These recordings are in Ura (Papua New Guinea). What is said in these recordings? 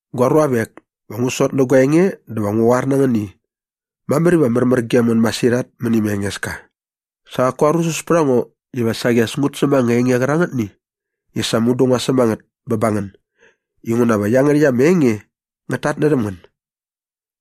Gua ruavek, va ngu sot nä gua enge dä va ngu qoar na ngän i mamär iva märmär gem ngän masirhat mäni ma Engeska. Sa qaku arusus pät a ngo iva saqi as ngut säm ama enge qärangätni i sa mudu ngua säm a ngät bä ba ngän inguna va iangärhäkt ama enge ngät tatnärhäm ngän.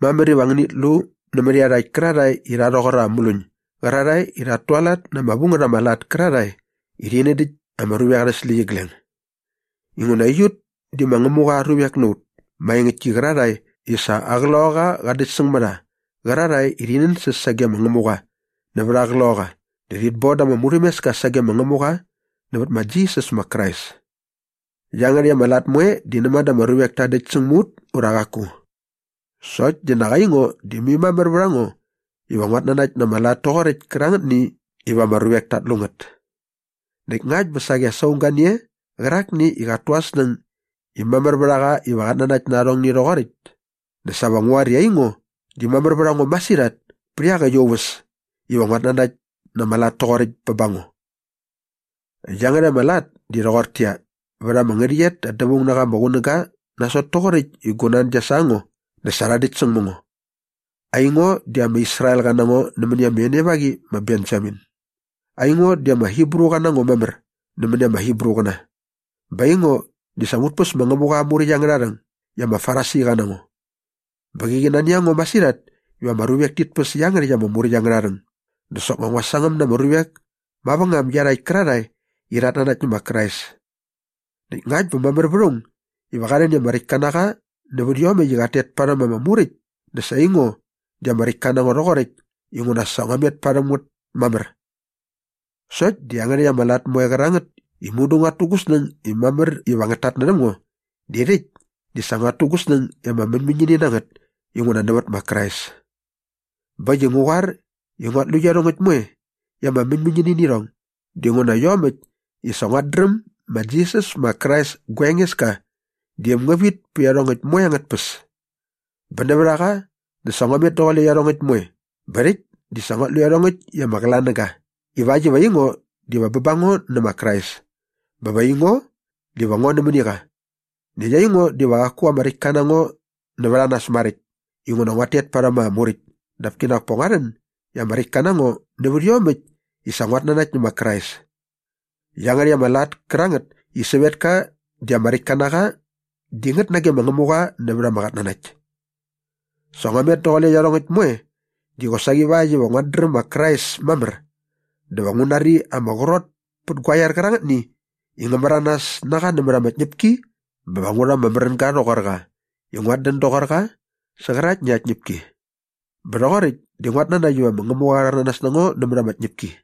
Mamär iva ngänit lu nämät iarhakt kärarhae i rha rhoqor ama mluñ gärarhae i rhat tualat na ama vu ngät ama lat kärarhae i rhi nädäkt ama ruvek arhä släqyigleng. Inguna aiut di ma Ngämuqa aa ruvek na ut maengäktki qärarhae i sa aa Qloqaqa qa däktsäng mä rha qärarhae i rhi nänsäs sage ma Ngämuqa nävät aa Qloqaqa dä urhit bon da ama murhämeska sagem ma Ngämuqa nävät ma Jisas ma Krais. Iangärhäkt ama lat moe di näma dä ama ruvek ta däktsäng mä ut ura qaku. Sokt di nak aingo di mai mamär vät a ngo iva nguat nanakt na ama lat toqoräkt kärangätni iva ama ruvek tat lu ngät. Näkt ngakt bä saqi as aung ga ni e qärakni i qat tu aa snäng i mamär vät a qa iva qat nanakt na arhongni rhoqoräkt dä sa va ngu qoar i aingo di mamär vät a ngo masirhat pä iaqäkt aa uväs iva nguat nanakt nä ama lat toqoräkt bä ba ngo. Iangärhäkt ama lat di rhoqortäqyia, vät ama ngärhäqyet da dävaung na qa ama qunäga nasot toqoräkt i gu nan gia sa ngo dä sa rha däkt säng mä ngo. Aingo di ama Israelqa na ngo nämäni ama enevaqi ma Benjamin. Aingo di ama Hibruqa na ngo mamär nämäni ama Hibruqäna. Bä aingo di sa ngut päs ma Ngämuqa aa Muräkt angärha rhäng i ama Farisiqa na ngo. Bä mäqi nani a ngo masirhat iva ama ruvek tit päs iangärhäkt ama Muräkt angärha rhäng dä soknga ngua sangäm na ama ruvek mavängam iarhakt kärarhae i rhat nanakt nä ma Krais. Näkt ngakt bä mamär vät aung iva qa rhän i ama räktka na qa nävät iomäkt i qat tet parhäm ama Muräkt dä sa aingo di ama räktka na ngo rhoqoräkt inguna sa ngua met parhäm ngät mamär. Sokt di iangärhäkt ama lat moe kärangät i mudu nguat tu gu snäng i mamär iva ngät tatnärhäm ngo di rhäkt di sa nguat tu gu snäng i ama mäñmäñini na ngät inguna nävät ma Krais. Bä äkt i ngu qoar i nguat lu iarhongäkt moe i ama mäñmäñini nä irhong dinguna iomäkt i sa nguat dräm ma Jisas ma Krais gua Engeska di äm ngä vit pä iarhongäkt moe angät tpäs. Bä nävät a qa dä sa ngua met daqule iarhongäkt moe bä rhäkt di sa nguat lu irhong i ama qlanäga ivakt iva aingo diva bä ba ngo nä ma Krais bä va aingo diva ngo nämäni qa. Näkt aingo diva qaku ama räktka na ngo nävät a nas maräkt inguna ngua met parhäm ama Muräkt dap kinak pa ngua rhän i ama räktka na ngo nävät iomäkt i sa nguat nanakt nä ma Krais. Iangärhäkt ama lat kärangät i sävetka di ama räktka na qa di ngät nage ma Ngämuqa nävät ama qatnanakt. Sa ngua met daqule iarhongäkt moe di qosaqi ivakt iva nguat dräm ma Krais mamär dä va ngu nari ama qrot pät gua iar qärangätni i ngä märanas na qa nämät ama tñäpki bä va ngu rha ama märänga rhoqor qa i nguat dän doqor qa sä qäraktni aa tñäpki bä rhoqoräkt di nguat nanakt iva ma Ngämuqa qa rhäranas na ngo nämät ama tñäpki.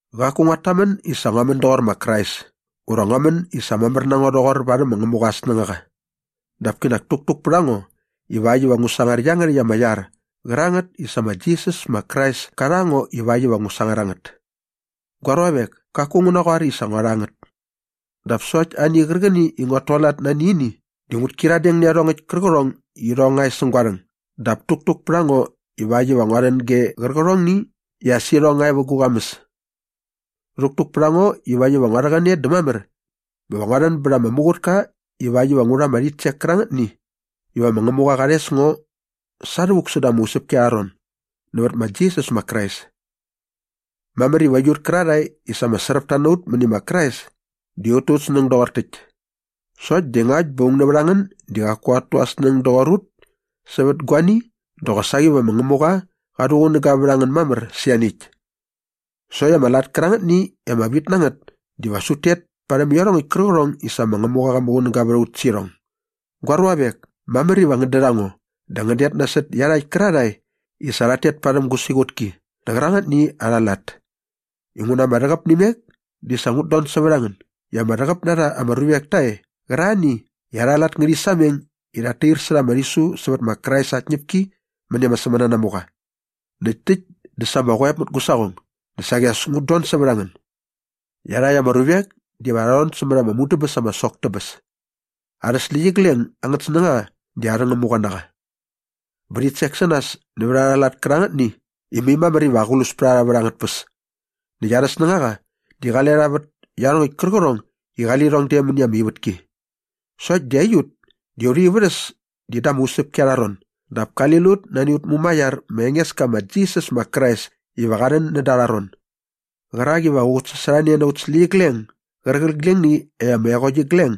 Qaku nguat tamän i sa ngua män doqor ma Krais ura ngua män i sa mamär na ngo rhoqor varhäm ma Ngämuqa aa snängaqa dap kinak täktuk pät a ngo ivakt iva ngu sangar iangärhäkt ama iar qärangät i sa ma Jisas ma Krais ka rha ngo ivakt iva ngu sangar a ngät. Gua ruavek, kaku ngu naqoar i sa ngua rha ngät. Dap sokt ani qärqäni i nguat tualat nani ini di ngut kyiradeng nä iarhongäkt kärqärhong i irhong nga e säng gua rhäng dap täktuk pät a ngo ivakt iva ngua rhän ge qärqärhongni i as irhong nga e vä gu qamäs. Rhäktuk pät a ngo ivakt iva ngua rhäqäne dä mamär bä va ngua rhän bät ama muqutka ivakt iva ngu rha ama rhitsek kärangätni iva ma Ngämuqa qa rhes ngo sa rhävuk säda ama usäpki arha ron nävät ma Jisas ma Krais. Mamär iva aiut kärarhae i sa ama sräpta na ut mäni ma Krais di ut tu ut snäng doqor täkt. Sokt di ngakt bä aung nävät a ngän di qaku qat tu aa snäng doqor ut sävät guani dä qosaqi va ma Ngämuqa qa rhuqunäga vät a ngän mamär sä ianiäkt. Sokt ama lat kärangätni i ama vit na ngät diva as ut tet parhäm iarhongäkt kärqärhong i sa ma Ngämuqa qa muqunäga vät a ut sä irhong. Gua ruavek, mamär iva ngän dät a ngo dä ngän det nasot iarhakt kärarhae i sa rhat tet parhäm gu siqutki nä qärangätni arha lat. Inguna ma ama rhäqäp nä imek di sa ngut don sävät a ngän i ama rhäqäp na rha ama ruvek ta e qärarhani i arha lat ngärhi sameng i rhat tair särha ama rhisu sävät ma Krais aa tñäpki mäni ama sämänanamuqa. Näkt täkt dä sa ama qoep mät gu saqong dä saqi as ngut don sävät a ngän. Iarhakt ama ruvek diva rha rhon sämät ama mudäbäs ama sok dä bäs. Arhä släqyigleng angät snängaqa di arhä ngämuqa na qa. Bä rhit sek sä nas nävät arha lat kärangätni i mai mamär iva aqlus pät a rha vät angät tpäs. Näkt arhä snängaqa di qale qa vät iarhongäkt kärqärhong i qali lirhong de mäni ama ivätki. Sokt di aiut di aurha ivärhäs di da ama usäpki arha ron dap kali lut nani aut Mumaiar ma Engeska ma Jisas ma Krais iva qa rhän näda arha ron qärak iva qä qutsasorhane na aut släqyigleng gärqiglengni i ama eqokt igleng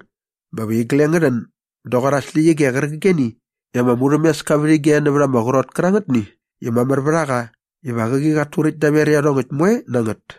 bä va igleng ngä rhän doqor aa släqyige qärqigeni i ama murhämeska vät ige nävät ama qrot kärangätni i mamär vät a qa iva qäqi qat turäkt daver iarhongäkt moe na ngät.